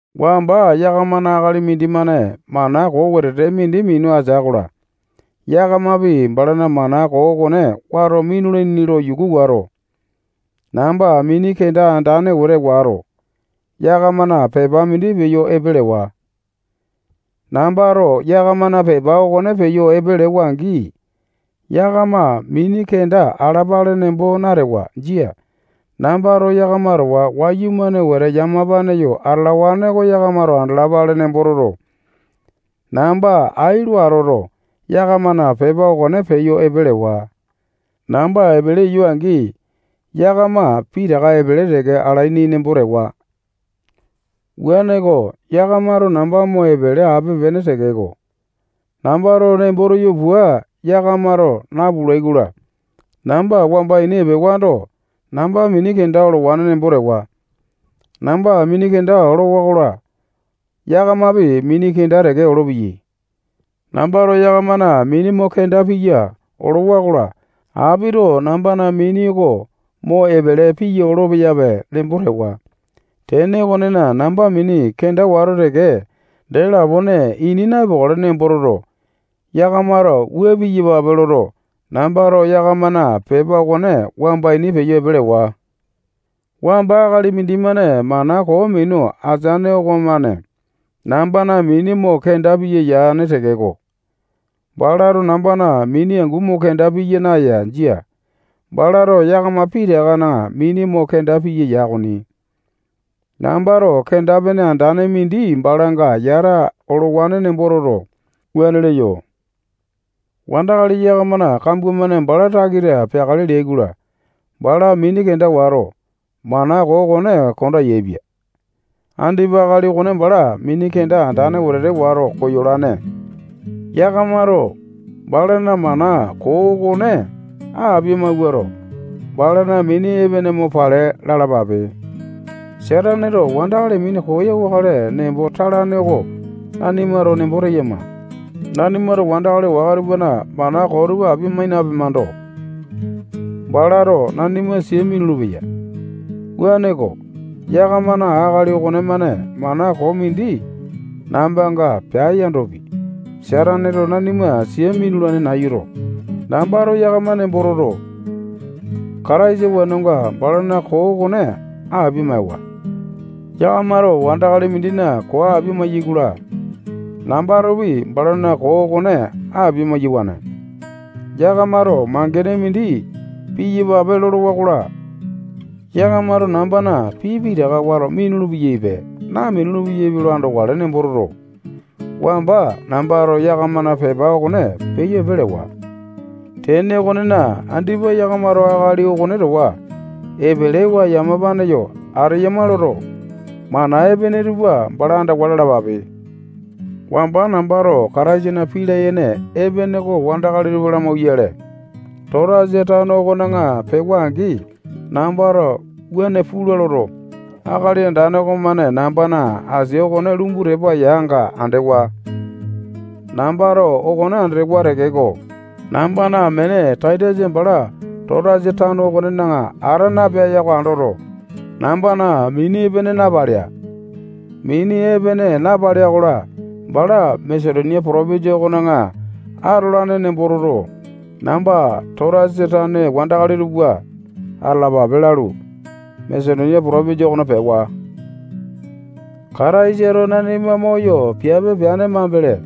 Wamba yakamana akali mindimane mana koo wetete mindi minu atea-kola, yakamapi balana mana koo okone wato minulaini lo yuku wato, namba mini kenda andane wete wato, yakamana pepa mindi peyo epe lewa. Nambato yakamana pepa okone peyo epe lewa-angi, yakama mini kenda alapale nembo natewa. Jia. Nambato yakama towa wayumane wete yamapane yo atalawane oko yakamato andalapale nembo toto, namba ai lo atoto, yakamana pepa okone peyo epe lewa. Namba epele eyo-angi, yakama pitaka epele teke alaini nembo tewa. Wuaneko, yakamato namba mo epele ape-pene tekeko, nambato nembo teyo pua yakamato napulai-kola, namba wamba ini epewando, namba mini kenda olowane nembo tewa. Namba mini kenda olowa-kola, yakamapi mini kenda teke olopeyai. Nambato yakamana mini mo kenda piya olowa-kola, apito nambana mini oko mo epele piya olo-peyape nembo tewa. Tene okonena, namba mini kenda wato teke, dee lapone ini na-epokale nembo toto, yakamato wua piyapape loto, nambato yakamana pepa okone wamba ini peyo epe lewa. Wamba akali mindimane mana koo minu ateane okomane nambana mini mo kenda piya yane tekeko, balato nambana mini angu mo kenda piya naya. Jia. Balato yakama pitakana mini mo kenda piya ya okoni. Nambato kenda-pene andane mindi balanga yata olowane nembo toto, wuane leyo. Wandakali yakamana kambua-mane bala takita peakale leai-kola, bala mini kenda wato, mana koo okone konda yaepia. Andipa akali okone bala mini kenda andane wetete wato koyolane-ko. Yakamato balana mana koo okone apia-mawuato, balana mini epene mo pale lalapape. Sataneto wandakali minu koyawakale nembo talane oko nanimato nembo teyama. Nanimato wandakali waka tupana mana koo tupa apia-mai napemando, balato nanima sia minulu-peya. Wuaneko, yakamana akali okonemane mana koo mindi nambanga pea yandopi, Sataneto nanima sia minulane nayuto, nambato yakama nembo toto, Kataisa wenonga, balana koo okone apia-maewa. Yakamato wandakali mindina koo apia maeyai-kola, nambatopi balana koo okone apia-maiyawane. Yakamato mangene mindi piyapape lolowa-kola, yakamato nambana pii pitaka wato minulu-peyaipe, napulu-peyaipe lo andokale nembo toto, wamba nambato yakamana pepa okone peyo epe lewa. Tene okonena, andipa yakamato akali okone towa epelewa yamapane yo ateyama loto, mana epene tupa bala andawa lalapape. Wamba nambato Kataisana pii layene epene oko wandakali tupa lamauwayale, Totasa tano okona pewa-angi, nambato wuane pula loto, Akali Andane okomane nambana asia okone lumbu tepa yanga andewa. Nambato okone andewa tekeko, nambana amene Taitasa bala Totasa tano okonena ata napea oko andoto, nambana mini epene napalea. Mini epene napalea-kola, bala Masetonia potopinjia okona atolane nembo toto, namba Totasa tane wandakali tupa atalapape lalu, Masetonia potopinjia okona pewa. Kataisato nanima moyo piape peane mambele,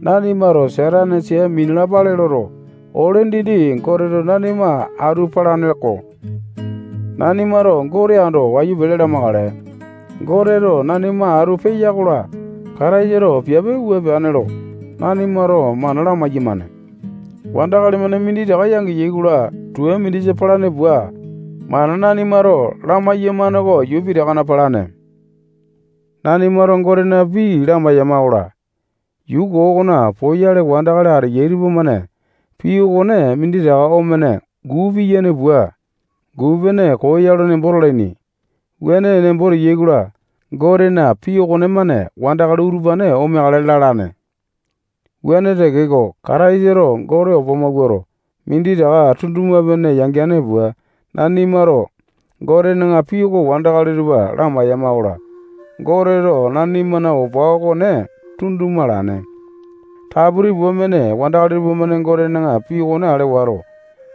nanimato Satane sia minalapale loto, ole dindi Goteto nanima atu palane-ko. Nanimato Gote ando wayu pele lamakale. Goteto nanima atu peya-kola, Kataisato piape wua peane lo nanimato mana lamai-yamane. Wandakali-mane minditaka yangeya-kola, tua mindisa palane pua, mana nanimato lamai-yamane oko yuu pitakana palane. Nanimato Gotena pii lamai-yamakola, yuu koo okona poyale wandakali ateyai tupamane pii okone minditaka omene guu piyane pua, guu-pene koo ya lo nembo talaini. Wuane nembo teyai-kola, Gotena pii okonemane wandakali utupane omeakale lalane. Wuane tekeko, Kataisato Gote opa mawuato, minditaka tunduma-pene yangeane pua, nanimato Gotena pii oko wandakali tupa lamai-yamakola, Goteto nanimana opa okone tunduma alane. Taputi pua mene wandakali tupamane Gotena pii okone ale wato,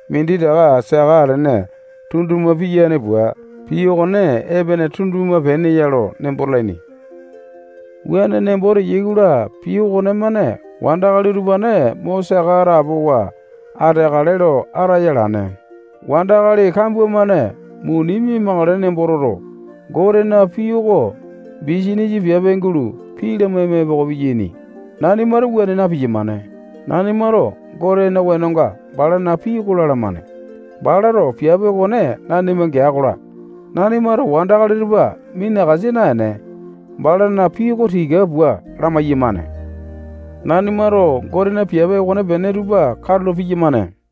minditaka saka atene tunduma piyane pua, pii okone epene tunduma-pene ya lo nembo talaini. Wuane nembo teyai-kola, pii okonemane wandakali utupane mo saka atapowa ateakale lo ataya alane. Wandakali kambua-mane muni mia-makale nembo toto, Gotena pii oko bisanisa piape gulo pii lamaima epoko piyaini. Nanimato wuane na-piyamane. Nanimato Gotena wenonga balana pii oko lalamane. Balato piape okone nanima gea-kola, nanimato wandakali tupa minakasa naene, balana pii oko tika pua lamai-yamane. Nanimato Gotena piape okonepene tupa katulo piyamane.